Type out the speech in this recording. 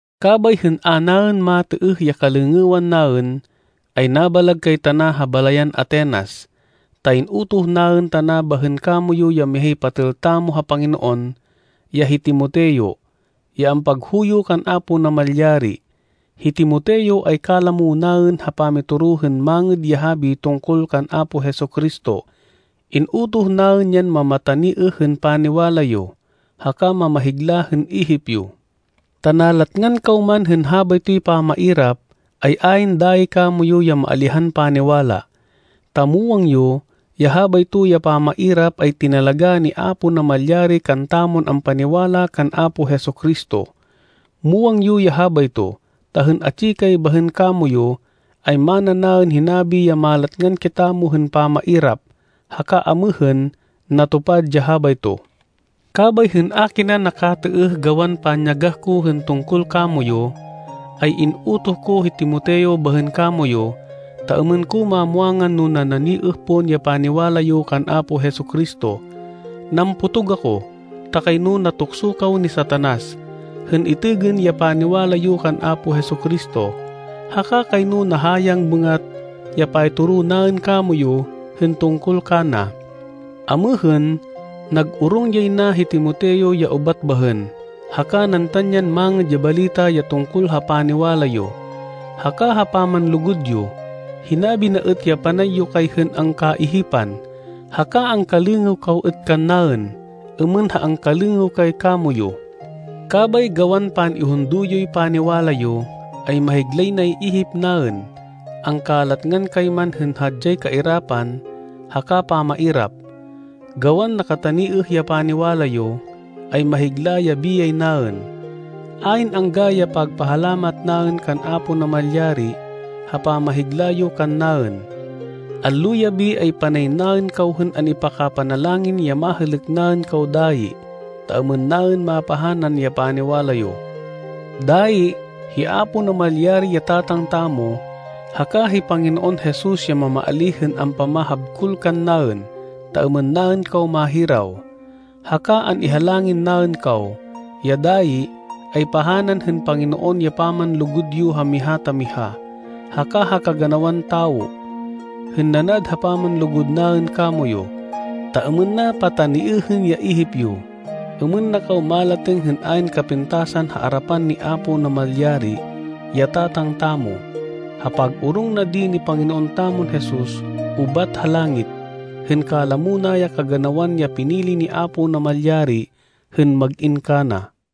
Kabay hên a naên matêêh ya kalêngêwan naên, ay nabalag kay tana ha balayan Atenas, ta in-utoh naên tana bahên kamoyu ya mihay patêl tamo ha Panginoon, ya hi Timoteo, ya ampaghuyo kan Apo Namalyari. Hi Timoteo ay kalamo naên ha pamitoro hên Mangêd ya Habi tungkol kan Apo Jesu-Cristo. In-utoh naên yan mamataniêh hên paniwala yo, haka mamahigla hên ihip yo, ta nalatngan kaw man hên habaytoy pamairap, ay ayn dayi kamoyu ya maalihan paniwala. Ta muwang yo ya habayto ya pamairap, ay tinalagá ni Apo Namalyari kantamon ampaniwala kan Apo Jesu-Cristo. Muwang yo ya habayto, ta hên atsi kay bahên kamoyu, ay mana naên hinabi ya malatngan kitamo hên pamairap, haka amêhên natupad ya habayto. Kabay hên a kina nakatêêh gawan panyagah ko hên tungkol kamoyu ay, in-utoh ko hi Timoteo bahên kamoyu ta êmên ko mamwangan no nananiêh pon ya paniwala yo kan Apo Jesu-Cristo. Nampotog ako ta kayno natukso kaw ni Satanas, hên itêgên ya paniwala yo kan Apo Jesu-Cristo, haka kayno nahayang bêngat ya paytoro naên kamoyu hên tungkol kana. Amêhên, nag-orong yay na hi Timoteo ya ubat bahên, haka nantan yan mangêd ya balita ya tungkol ha paniwala yo, haka ha pamanlugud yo. Hinabi na êt ya panay yo kay hên angkaihipan, haka angkalêngêw kaw êt kannaên, êmên ha angkalêngêw kay kamoyu. Kabay, gawan pan-ihundo yoy paniwala yo, ay mahiglay nay ihip naên, angkalatngan kay man hên hadyay kairapan haka pamairap. Gawan nakataniêh ya paniwala yo, ay mahigla ya biyay naên. Ayn angga ya pagpahalamat naên kan Apo Namalyari ha pamahigla yo kannaên. Allo-yabi ay panay naên kaw hên an-ipaka-panalangin ya mahêlêk naên kaw dayi, ta êmên naên mapahanan ya paniwala yo. Dayi, hi Apo Namalyari, ya Tatang tamo, haka hi Panginoon Jesus ya mamaalíh hên ampamahabkol kannaên ta êmên naên kaw mahiraw. Haka an-ihalangin naên kaw, ya dayi, ay pahanan hên Panginoon ya pamanlugud yo ha miha ta miha, haka ha kaganawan tawo, hên nanad ha pamanlugud naên kamoyu. Ta êmên na pataniêhên ya ihip yo, êmên na kaw malatêng hên ayn kapintasan ha arapan ni Apo Namalyari, ya Tatang tamo, ha pag-orong na di ni Panginoon tamon Jesus ubat ha langit, hên kalamo na ya kaganawan ya pinili ni Apo Namalyari hên mag-in kana.